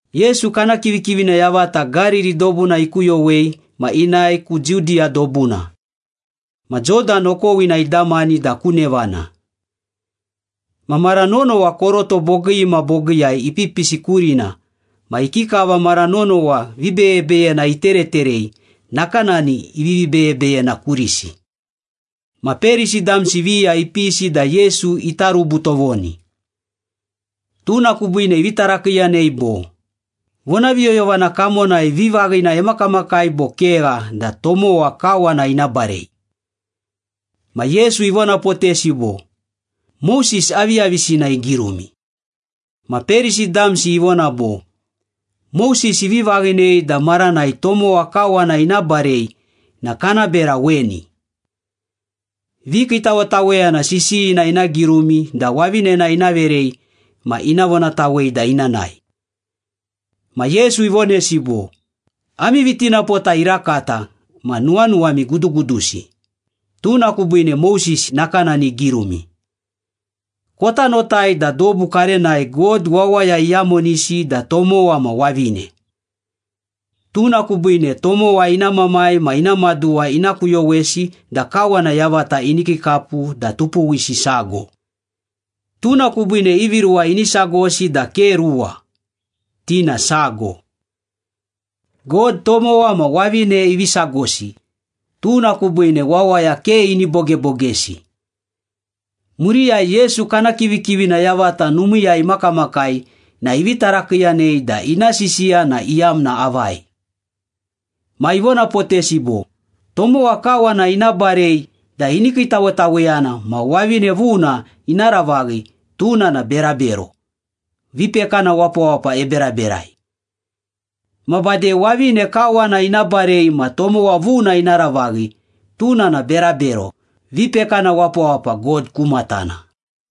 Yesu kana kivikivina yavata Gariri dobuna ikuyowei ma inae ku Judiya dobuna. Ma Jodan okowina idamani da ku nevana. Ma mara nonowa koroto bogii ma bogiiyai ipipisi kurina ma ikikava mara nonowa vibeyebeyena itereterei, nakanani ivivi beyebeyena kurisi. Ma Perisi damsi viya ipisi da Yesu ita rubu tovoni. Tuna kubiine ivi tarakiiyanei bo, “Vonaviyoyovana kamonai vivaghina emakamakai bo kegha da tomowa kawana ina barei?” Ma Yesu ivonapotesi bo, “Moses aviyavisina igirumi?” Ma Perisi damsi ivona bo, “Moses ivi vaghinei da maranai tomowa kawana ina barei na kana bera weni. Vikiitawetaweyana sisiyina ina girumi da wavinena ina verei ma ina vonatawei da ina nae.” Ma Yesu ivonesi bo, “Ami vitinapota irakata ma nuwanuwami gudugudusi, tuna kubiine Moses nakanani igirumi. Kota notai da dobu karenai ‘God wawaya iyamonisi da tomowa ma wavine.’ ‘Tuna kubiine tomowa ina mamai ma ina maduwa ina kuyowesi da kawana yavata ini kiikapu da tupuwsi sago.’ Tuna kubiine ivi ruwa ini sagosi da ke ruwa, ti na sago. God tomowa ma wavine ivi sagosi, tuna kubiine wawaya ke ini bogebogesi.” Muriyai Yesu kana kivikivina yavata numiiyai imakamakai na ivi tarakiiyanei da ina sisiya na iyamna avai. Ma ivonapotesi bo, “Tomowa kawana ina barei da ini kiitawetaweyana ma wavine vuna ina ravaghi, tuna na berabero, vipekana wapawapa eberaberai. Ma bade wavine kawana ina barei ma tomowa vuna ina ravaghi, tuna na berabero, vipekana wapawapa God ku matana.”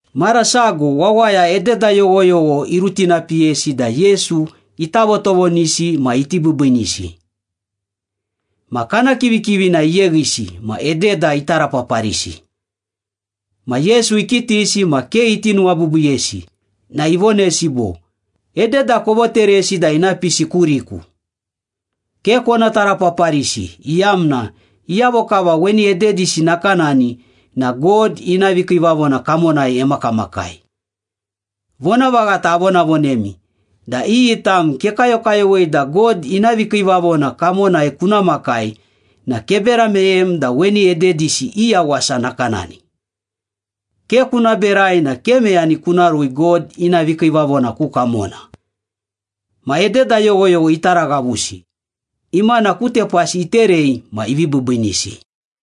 Mara sago wawaya ededa yoghoyogho irutinapiyesi da Yesu ita votovonisi ma iti biibiinisi. Ma kana kivikivina iyeghisi ma ededa itarapaparisi. Ma Yesu ikitisi ma ke iti nuwabiibiiyesi na ivonesi bo, “Ededa kovoteresi da ina pisi kuriku. Ke kona tarapaparisi iyamna iyavo kava weni ededisi nakanani na God ina vikiivavona kamonai emakamakai. Vonavaghata avonavonemi da iyi tam kekayokayowei da God ina vikiivavona kamonai kuna makai na kebera meyem da weni ededisi i yawasa nakanani. Ke kuna berai na ke meyani kuna rui God ina vikiivavona ku kamona.” Ma ededa yoghoyogho itaraghavusi, imana ku tepasi iterei ma ivi biibiinisi.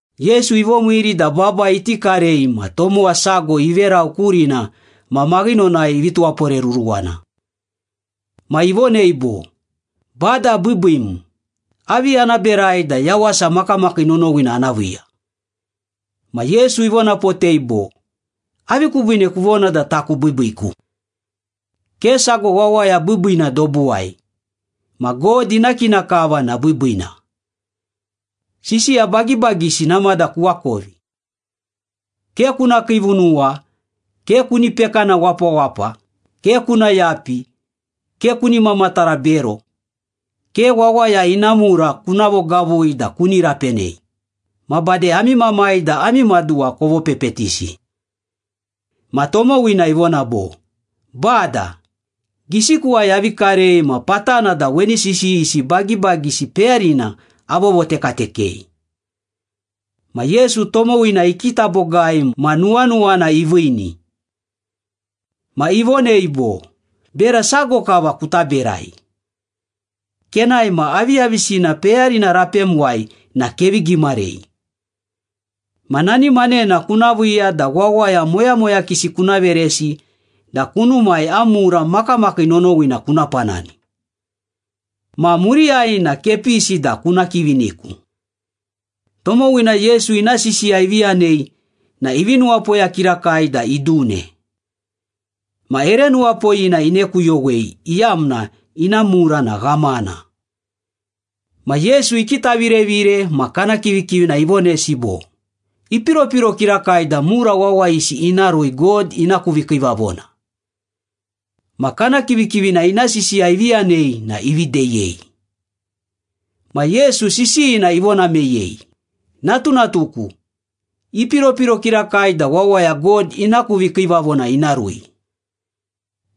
Yesu ivomiiri da baba iti karei ma tomowa sago iverau kurina ma maghinonai ivi tuwaporeruruwana. Ma ivonei bo, “Bada biibiim, avi ana berai da yawasa makamakii nonowina ana viiya?” Ma Yesu ivonapotei bo, “Avi kubiine kuvona da taku biibiiku? Ke sago wawaya biibiina dobuwai, ma God ina kina kava na biibiina. Sisiya bagibagisi namada kuakovi. ‘Ke kuna kiivunuwa, ke kuni pekana wapawapa, ke kuna yapi, ke kuni mamatara bero, ke wawaya ina mura kuna vogavui da kuni rapenei, ma bade ami mamai da ami maduwa kovopepetisi.’” Ma tomowina ivona bo, “Bada, gisikuwai avi karei ma patana da weni sisiyisi bagibagisi peyarina avovotekatekei.” Ma Yesu tomowina ikita bogai ma nuwanuwana iviini. Ma ivonei bo, “Bera sago kava kuta berai. Kenae ma aviyavisina peyarina rapemuwai na kevi gimarei. Ma nani manena kuna viiya da wawaya moyamoyakisi kuna veresi da kunumai am mura makamakii nonowina kuna panani. Ma muriyai na kepisi da kuna kiviniku.” Tomowina Yesu ina sisiya ivi yanei na ivi nuwapoya kirakai da idune. Ma ere nuwapoyina inekuyowei iyamna ina mura na ghamana. Ma Yesu ikitavirevire ma kana kivikivina ivonesi bo, “Ipiropiro kirakai da mura wawayisi ina rui God ina ku vikiivavona.” Ma kana kivikivina ina sisiya ivi yanei na ivi deyei. Ma Yesu sisiyina ivona meyei, “Natunatuku, ipiropiro kirakai da wawaya God ina ku vikiivavona ina rui.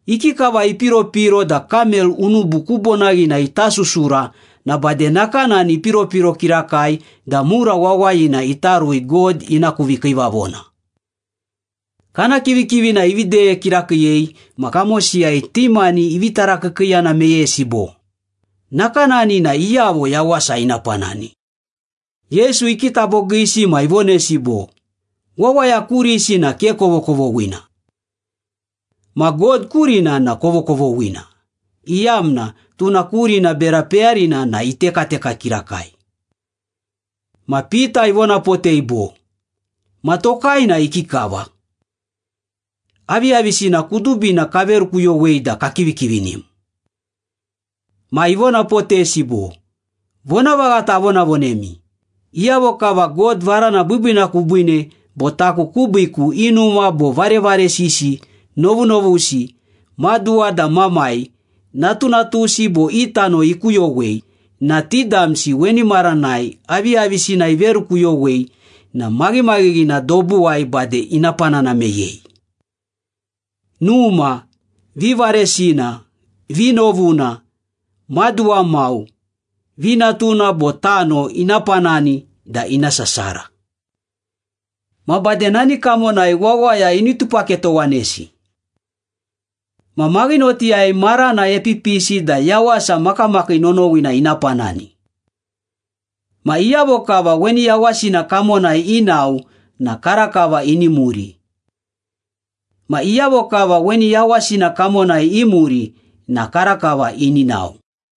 Ikikava ipiropiro da kamel unubu ku bonaghina ita susura na bade nakanani ipiropiro kirakai da mura wawayina ita rui God ina ku vikiivavona.” Kana kivikivina ivi deye kirakiiyei ma kamosiyai ti mani ivi tarakiikiiyana meyesi bo, “Nakanani na iyavo yawasa ina panani?” Yesu ikita bogiisi ma ivonesi bo, “Wawaya kurisi na ke kovokovoghina. Ma God kurina na kovokovoghina, iyamna tuna kurina bera peyarina na itekateka kirakai.” Ma Pita ivonapotei bo, “Ma tokai na ikikava? Aviyavisina kudubina kaverukuyowei da kakivikivinim.” Ma ivonapotesi bo, “Vonavaghata avonavonemi, iyavo kava God varana biibiina kubiine bo taku kubiiku i numa bo varevaresisi, novunovusi, maduwa da mamai, natunatusi bo i tano ikuyowei, na ti damsi weni maranai aviyavisina iverukuyowei na maghimaghighina dobuwai bade ina panana meyei. Numa, vivaresina, vinovuna, maduwa mau, vinatuna bo tano ina panani da ina sasara. Ma bade nani kamonai wawaya ini tupaketowanesi. Ma maghinotiyai marana epipisi da yawasa makamakii nonowina ina panani. Ma iyavo kava weni yawasina kamonai inao na karakava ini muri. Ma iyavo kava weni yawasina kamonai imuri na karakava ini nao.”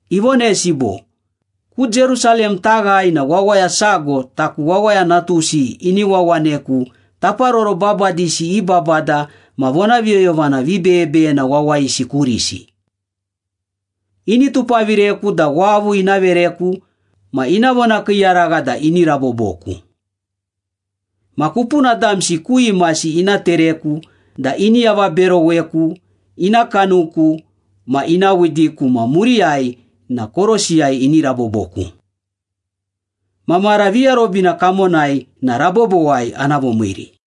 Ivonesi bo, “Ku Jerusalem taghae na wawaya sago taku Wawaya Natusi ini wawaneku taparoro babadisi i babada ma vonaviyoyovana vibeyebeyena wawayisi kurisi. Ini tupavireku da wavu ina vereku ma ina vonakiiyaragha da ini raboboku. Ma kupuna damsi ku imasi ina tereku da ini avaberoweku, ina kanuku ma ina widiku ma muriyai na korosiyai ini raboboku. Ma mara viarobina kamonai na rabobowai ana vomiiri.”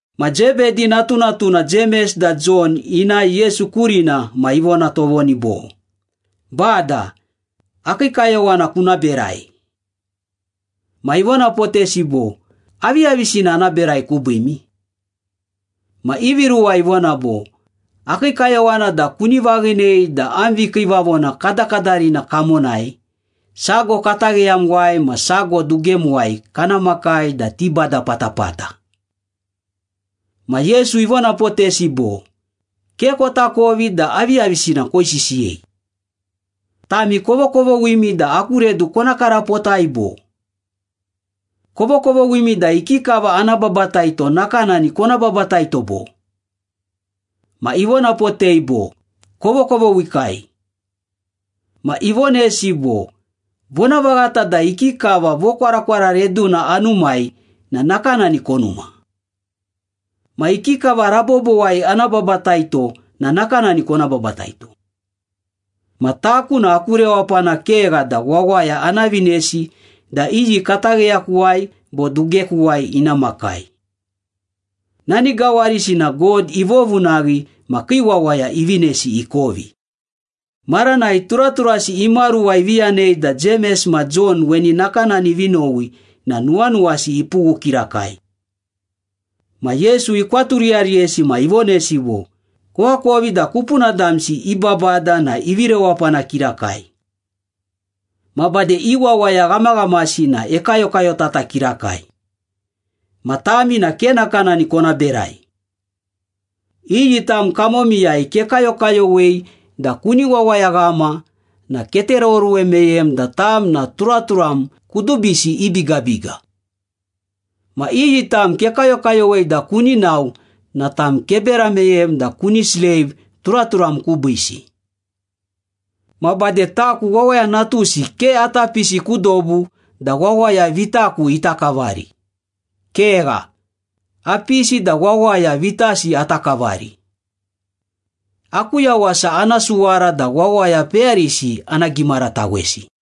Ma Zebedi natunatuna Jemes da Jon inae Yesu kurina ma ivona tovoni bo, “Bada, akii kayowana kuna berai.” Ma ivonapotesi bo, “Aviyavisina ana berai kubiimi?” Ma ivi ruwa ivona bo, “Akii kayowana da kuni vaghinei da am vikiivavona kadakadarina kamonai, sago katagheyamuwai ma sago dugemuwai kana makai da tibada patapata.” Ma Yesu ivonapotesi bo, “Ke kotakovi da aviyavisina koisisiyei. Tami kovokovoghimi da aku redu kona karapotai, bo? Kovokovoghimi da ikikava ana babataito nakanani kona bapataito, bo?” Ma ivonapotei bo, “Kovokovoghikai.” Ma ivonesi bo, “Vonavaghata da ikikava vokwarakwara reduna anumai na nakanani konuma. Ma ikikava rabobowai ana babataito na nakanani kona babataito. Ma taku na aku rewapana kegha da wawaya ana vinesi da iyi katagheyakuwai bo dugekuwai ina makai. Nani gawarisi na God ivovunaghi ma kii wawaya ivinesi ikovi.” Maranai turaturasi imaruwa ivi yanei da Jemes ma Jon weni nakanani ivi nowi na nuwanuwasi ipughu kirakai. Ma Yesu ikwaturiyariyesi ma ivonesi bo, “Koakovi da kupuna damsi i babada na ivi rewapana kirakai. Ma bade i wawaya ghamaghamasi na ekayokayotata kirakai. Ma tami na ke nakanani kona berai. Iyi tam kamomiyai kekayokayowei da kuni wawayaghama na ketereoruwe meyem da tam na turaturam kudubisi i bigabiga. Ma iyi tam kekayokayowei da kuni nao na tam kebera meyem da kuni sleiv turaturam kubiisi. Ma bade taku Wawaya Natusi ke ata pisi ku dobu da wawaya vitaku ita kavari. Kegha, apisi da wawaya vitasi ata kavari. Aku yawasa ana suwara da wawaya peyarisi ana gimaratawesi.”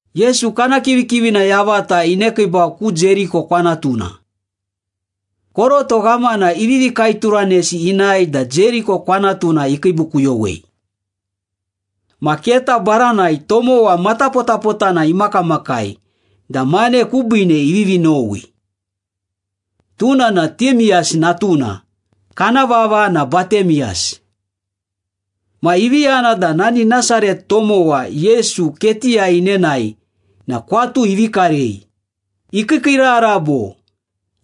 Yesu kana kivikivina yavata inekiibau ku Jeriko kwanatuna. Koroto ghamana ivivi kaeturanesi inae da Jeriko kwanatuna ikiibukuyowei. Ma keta baranai tomowa matapotapotana imakamakai da mane kubiine ivivi nowi. Tuna na Timeyas natuna, kana vava na Batimeyas. Ma ivi yana da nani Nasaret tomowa Yesu ketiyai inenae na kwatu ivi karei, ikiikiirara bo,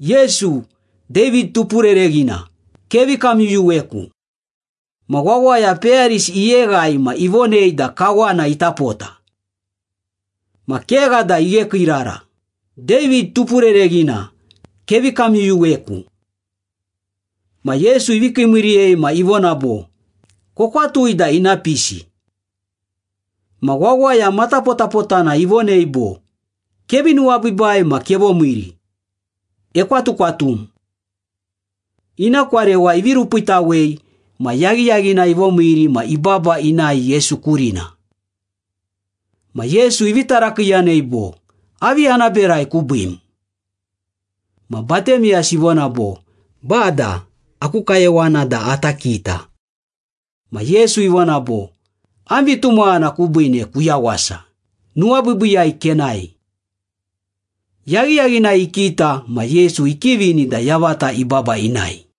“Yesu! David Tupurereghina, kevi kamyuyuweku.” Ma wawaya peyarisi iyeghai ma ivonei da kawana ita pota. Ma kegha da ighekiirara, “David Tupurereghina, kevi kamyuyuweku!” Ma Yesu ivi kiimiiriyei ma ivona bo, “Kokwatui da ina pisi.” Ma wawaya matapotapotana ivonei bo, “Kevi nuwabiibai ma kevomiiri. Ekwatukwatum.” Ina kwarewa ivi rupiitawei ma yaghiyaghinai ivomiiri ma ibaba inae Yesu kurina. Ma Yesu ivi tarakiiyanei bo, “Avi ana berai kubiim?” Ma Batimeyas ivona bo, “Bada, aku kayowana da ata kita.” Ma Yesu ivona bo, “Am vitumaghana kubiine kuyawasa, nuwabiibiiyai kenae.” Yaghiyaghinai ikita ma Yesu ikivini da yavata ibaba inae.